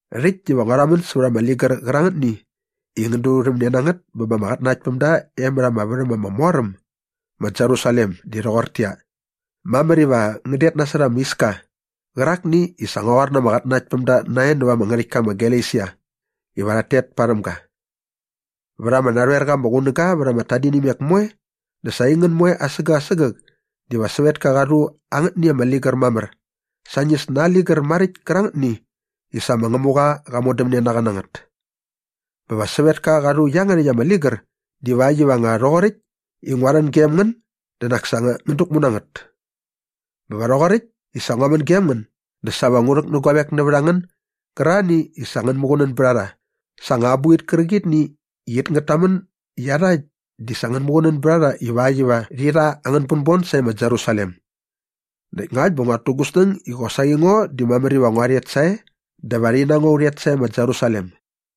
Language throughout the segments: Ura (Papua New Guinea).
Rhäkt diva ngua rhamän sävät ama ligär qärangätni i ngän durhämne na ngät bä ba ama qatnanaktpämda e mät ama värhäm ama mor äm ma Jerusalem di rhoqortäqyia, mamär iva ngän det nasot ama iska qärakni i sa ngua qoar na ama qatnanaktpämda nae näva ama ngärhäktka ma Galesia iva rhat tet parhäm ga. Vät ama narhoer qa ama qunäga vät ama tadinimek moe dä sa aingän moe asägäk asägäk diva sävetka qa rhu angätni ama ligär mamär sañis na aa ligär maräkt kärangätni i sa ma Ngämuqa qa modämne na qa na ngät. Bä va sävetka qa rhu iangärhäkt ama ligär divakt iva nga rhoqoräkt iva ngua rhän gem ngän dä nak sa ngän däkmu na ngät. Bä va rhoqoräkt i sa ngua män gem ngän dä sa va ngu rhäk nä guavek nävät a ngän gärarhani i sa ngän muqunän bät a rha sa anga abuqit kärqitni i it ngät tamän i iarhakt di sa ngän muqunän bät a rha ivakt iva rhi rha angän bänbon sae ma Jerusalem. Näkt ngakt bä nguat tu gu snäng i qosaqi ngo di mamär iva ngua rhet sae dä va rhi na ngo u rhet sae ma Jerusalem.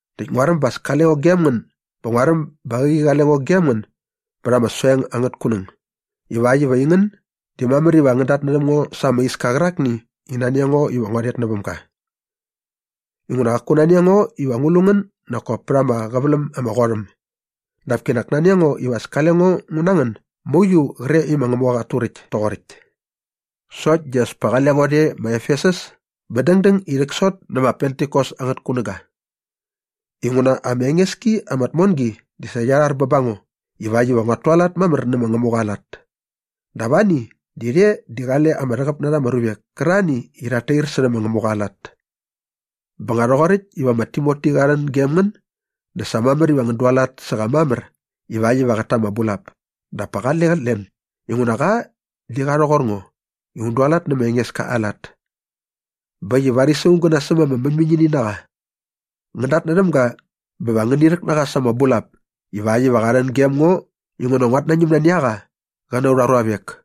näkt nguaräm ba as kale ngo gem ngän bä nguaräm ba qäqi qale ngo gem ngän bät ama soeng angät kunäng ivakt iva aingän di mamär iva ngän datnärhäm ngo sa ama iska qärakni i nani a ngo iva ngua rhet näväm ga. Inguna qaku nani a ngo iva ngu lu ngän nak kop pät ama qäväläm ama qot äm dap kinak nani a ngo iva as kale ngo ngu na ngän mauiu qre i ma Ngämuqa qat turäkt toqoräkt. Sokt di as pa qale ngo rhe ma Efesus bä dängdäng i rhäksot nä ma Pentikos angät kunäga inguna ama enges ki ama tmongi di sa qia rhar bä ba ngo ivakt iva nguat tualat mamär nä ma Ngämuqa aa lat. Dap ani di rhe di qale ama rhäqäp na rha ama ruvek kärarhani i rhat tair särhä ma Ngämuqa aa lat. Bä nga rhoqoräkt iva ma Timoti qa rhän gem ngän dä sa mamär iva ngän dualat sä qa mamär ivakt iva qät ta ama bulap dap pa qale qät len inguna qa di qa rhoqor ngo i un dualat nä ma Engeska aa lat. Bä äkt i varis aung gä nasäm ama mäñmäñini na qa. Ngän datnärhäm ga bä va ngäni rhäk na qa sa ama bulap ivakt iva qa rhän gem ngo inguna nguat nañäm nani a qa qä na aurha ruavek.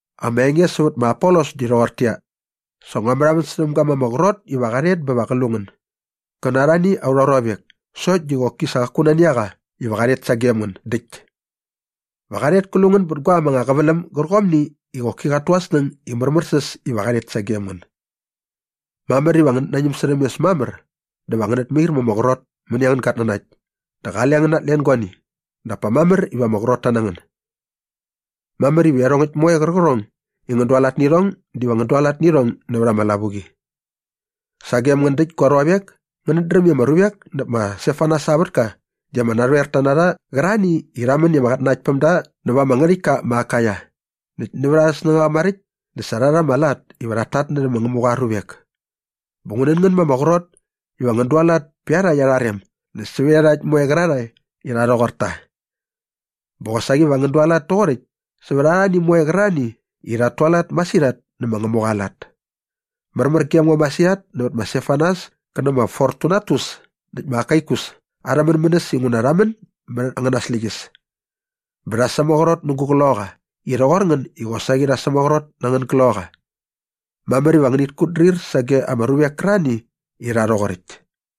Ama enge sävät ma Apolos di rhoqortäqyia, sa ngua märhamän särhäm ga ma ama qrot iva qa rhet bä va qä lu ngän gä na arhani aurha ruavek sokt di qoki sa qaku nani a qa iva qa rhet sagem ngän däkt. Va qa rhet kä lu ngän bät guaäm anga qäväläm gärqomni i qoki qat tu aa snäng i märmärsäs iva qa rhet sagem ngän. Mamär iva ngänät nañäm särhäm mes mamär dä va ngänät mair ma ama qrot mäni angän gatnanakt dä qale ngän natlen guani dap pa mamär iva ama qrotta na ngän. Mamär iva iarhongäkt moe qärqärhong i ngän dualat nä irhong diva ngän dualat nä irhong nävät ama lavuqi. Sagem ngän däkt gua ruavek, ngänät dräm i ama ruvek näp ma Stefanas aa vätka di ama narhoerta na rha qärarhani i rha män i ama qatnanaktpämda näva ama ngärhäktka ma Akaia. Näkt nävät arhä snängaqa maräkt dä sa rha rha ama lat iva rhat tatnärhä ma Ngämuqa aa ruvek. Bä ngu nän ngän ma ama qrot iva ngän dualat pä iarhakt arha rem näkt sävät iarhakt moe qärarhae i rha rhoqor ta. Bä qosaqi va ngän dualat toqoräkt sävät arhani moe qärarhani i rhat tualat masirhat nä ma Ngämuqa aa lat. Märmär gem ngo masirhat nävät ma Stefanas kä nä ma Fortunatus näkt ma Akaikus arhä mänmänäs inguna rha män mät angäna släqyäs bä rha sämaqrot nä gu qloqaqa i rhoqor ngän i qosaqi rha sämaqrot na angän gloqaqa. Mamär iva ngänit kutdrir sage ama ruvek kärarhani i rha rhoqoräkt.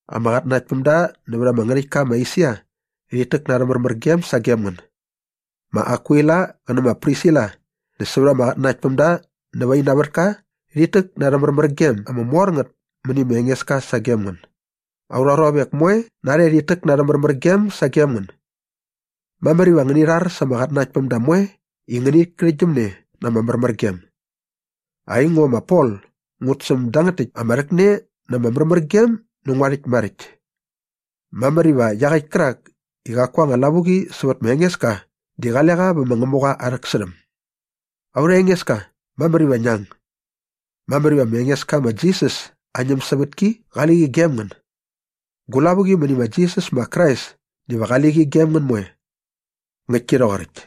Ama qatnanaktpämda nävät ama ngärhäktka ma Esia rhit täk na arhä märmärgem sagem ngän. Ma Akwila qä nä ma Prisila näkt sävät ama qatnanaktpämda nävä ina vätka rhit täk na arhä märmärgem ama mor ngät mäni ma Engeska sagem ngän. Aurha ruavek moe narhe di rhit täk na arhä märmärgem sagem ngän. Mamär iva ngäni rhar sa ama qatnanaktpämda moe i ngänit kärhäktgyäm ne na ama märmärgem. Aingo ma Pol ngut säm dangät täkt ama rhäkne na ama märmärgem nä ngua rhäkt maräkt. Mamär iva iaqäkt kärak i qaku aa anga lavuqi sävät ma Engeska di qale qa vä ma Ngämuqa aa rhäksärhäm. Aurha Engeska, mamär iva ngia ang! Mamär iva ma Engeska ma Jisas aa ñämsävätki qali qi gem ngän. Gu lavuqi mäni ma Jisas ma Krais diva qali qi gem ngän moe. Ngäktki rhoqoräkt.